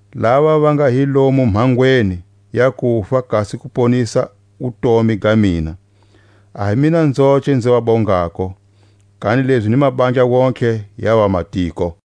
lava va nga hi lomu mhangweni ya kufa kasi ku ponisa wutomi ga mina. A hi mina nzoce nzi va bongako, kanilezi ni mabandla wontihe ya vamatiko.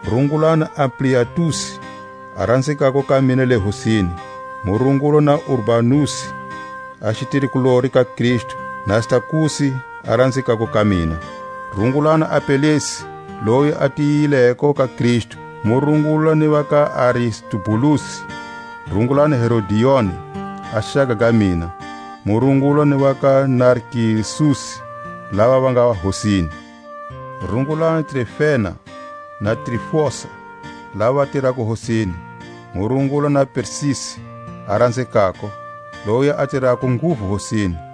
Rungulani Ampliatusi, a ranzekako ka mina le Hosini. Mu rungula na Urbanusi a xitirikulori ka Kristu, na Stakusi a ranzekako ka mina. Rungulani Apelesi loyi a tiyileko ka Kristu. Mu rungula ni va ka Aristubulusi. Rungulani Herodioni, a xaka ga mina. Mu rungula ni va ka Narkisusi, lava va nga Hosini. Rungulani Trifena na Trifosa, lava va tirako Hosini. Mu rungula na Persisi a ranzekako, loyi a tirako nguvu Hosini.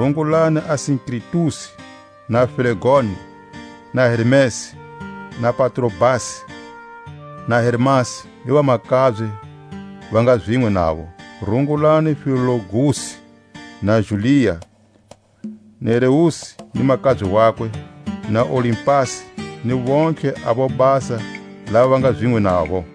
Rungulani Asinkritusi, na Flegoni, na Hermesi, na Patrobasi, na Hermasi ni vamakabye va nga zinwe navo. Rungulani Filologusi na Julia, Nereusi ni makabye wakwe, na Olimpasi, ni vontlhe a vobasa lava va nga zinwe navo.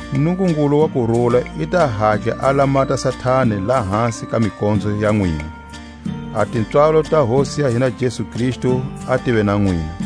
Nungungulu wa kurula i ta hatla a lamata Satani lahasi ka mikonzo ya nwina. A tipswalo ta Hosi ya hina Jesu Kristu a tive na nwina.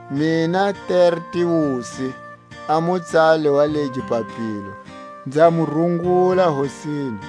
Mina Tertiusi, a mutsali wa legi papilo, nza mu rungula Hosini.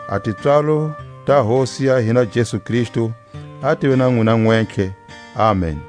A tipswalo ta Hosi ya hina Jesu Kristu a tive na nwina nwentlhe. Amen.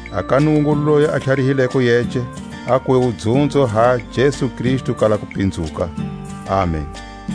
a ka Nungungulu loyi a tlharihileko yece, a kuve wudzunzo ha Jesu Kristu kala kupinzuka. Amen.